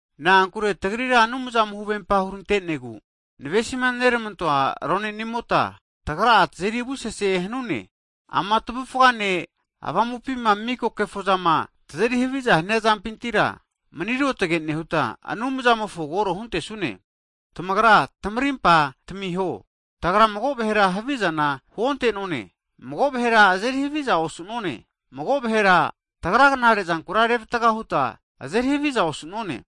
Na'ankure tagrira Anumzamo huvempa hurante'negu, navesima neramantoa ronenimota, tagra'a tazeri avusese hanune. Ama tavufgafine avamupima miko kefozamo'ma tazeri haviza hania zampintira, mani ruotage nehuta Anumzamofo koro huntesune. Tamagra tamarimpa tamiho. Tagra mago vahera havizana huonte'none, mago vahera azeri haviza osu'none, mago vahera tagra knare'zankura revatga huta azeri haviza osu'none.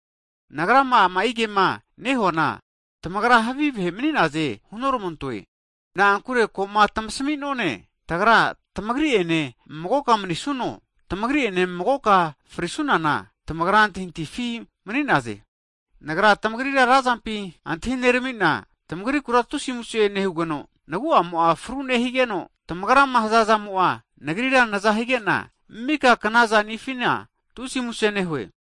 Nagrama ama'i kema nehuana, tamagra havi vahe mani'naze hunoramantoe. Na'ankure koma tamasimi'none, tagra tamagri ene magoka manisuno, tamagri'ene magoka frisunana tamagra antahintahifi mni'naze. Nagra tamagrira razampi antahinerami'na, tamagrikura tusi muse nehugeno, nagu'amo'a fru nehigeno, tamagrama hazazamo'a nagrira naza higena, mika knazanifina tusi muse nehue.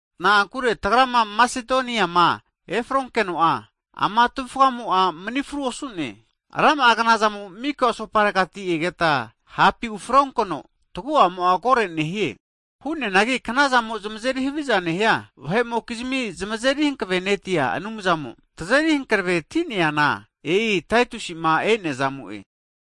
Na'ankure tagrama Masedonianema efronkeno'a, ama tavufgamo'a manifru osu'ne, rama'a knazamo mika asoparegati egeta hapi ufronkeno, tagu'amo'a kore nehie. Hu'neanagi knazamo zamazeri haviza nehia vahe'mokizmi zamazeri hankavenetia Anumzamo tazeri hankavetineana, e'i Taitusi'ma e'nea zamo'e.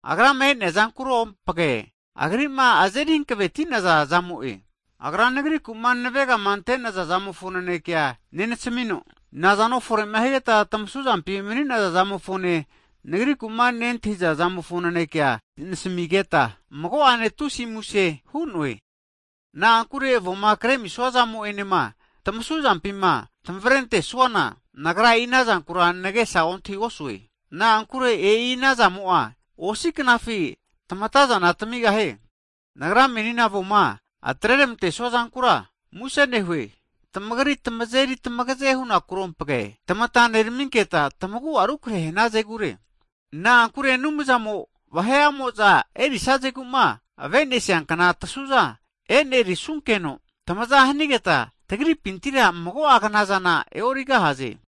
Agrama e'nea zamokero'ompage, agri'ma azeri hankaveti'naza'zamo'e. Agra nagriku'ma navegama ante'naza'zamofo nanekea nenasamino, nazano fore'ma higeta tamasuzampima maninaza'zamofone, nagriku'ma nentahiza'zamofo nanekema nasamigeta, mago'ane tusi muse hu'noe. Na'ankure avoma kreramisua zamo'enema tamasuzampima tamavrentesuana, nagra e'i anazankura nagesa ontahigosue, na'ankure e'i anazamo'a osi'a knafi tamatazana tamigahie. Nagra menima avoma atreramantesua zankura muse nehue. Tamagri tamazeri tamagaze hunakuro ompage, tamata neraminketa tamagu'a rukrehe hanazegure. Na'ankure Anumzamo, vahe'amo'za erisazeguma avenesiankna tasuza e'nerisunkeno, tamaza hanigeta tagripintira mago'a knazana e'origahaze.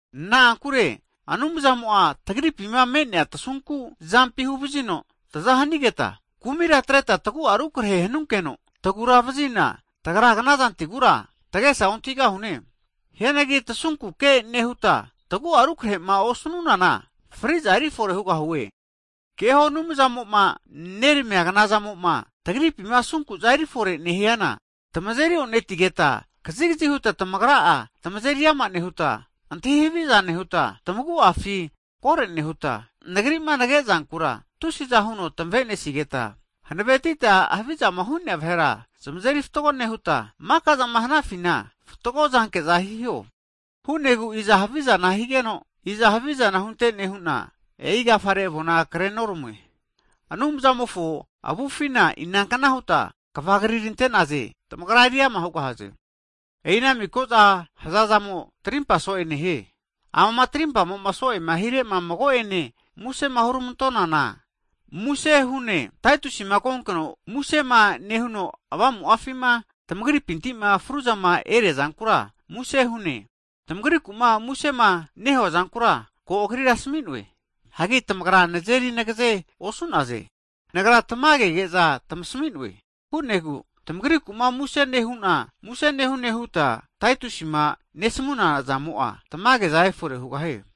Na'ankure Anumzamo'a tagripima me'nea tasunku zampi huvazino taza hanigeta, kumira atreta tagu'a rukrehe hanunkeno taguravazina, tagra knazantigura tagesa ontahigahune. Hianagi tasunkuke nehuta tagu'a rukrehema osnunana, fri'za erifore hugahie. Keho Anumzamo'ma neramia knazamoma tagripima asunku'za erifore nehiana, tamazeri o'netigeta kazigazi huta tamagra'a tamazeri ama nehuta, antahi haviza nehuta, tamagu'afi kore nehuta, nagri'ma nagezankura tusiza huno tamavenesigeta, hanavetita havizama hu'nea vahera zmazeri fatgo nehuta, makazama hanafina fatgo zanke'za hiho. Ana hu'negu iza havizana higeno, iza havizana huntene hu'na, e'i agafare avona krenoramue. Anumzamofo avufina inankna huta kva krinerantaze, tamagra eriama hugahaze. E'i ana miko'za hazazamo'a, trimpa so'e nehie. Amama tarimpamo'ma so'ema hirema mago'ene musema huramantonana, Taitusima konkeno musema nehuno avamu'afima tamagripintima fruzama eriazankura muse hune. Tamagriku'ma musema nehua zankura, ko agrira asami'noe. Hagi tamagra nazeri nageze osu'naze, nagra tamagege'za tamasmi'noe. Hu'negu tamagriku'ma muse nehune huta Taitusima nesamuna zamo'a, tamage'za efore hugahie.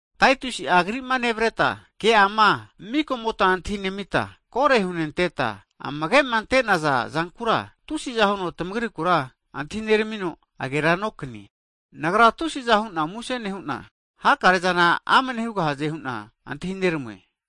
Taitusi'a agri'ma nevreta, ke'ama mikomota antahinemita, kore hunteta amagema antenaza zankura, tusiza huno tamagrikura antahineramino agera nokanie. Nagra tusiza hu'na muse nehu'na, hakarezana amne hugahaze hu'na antahineramue.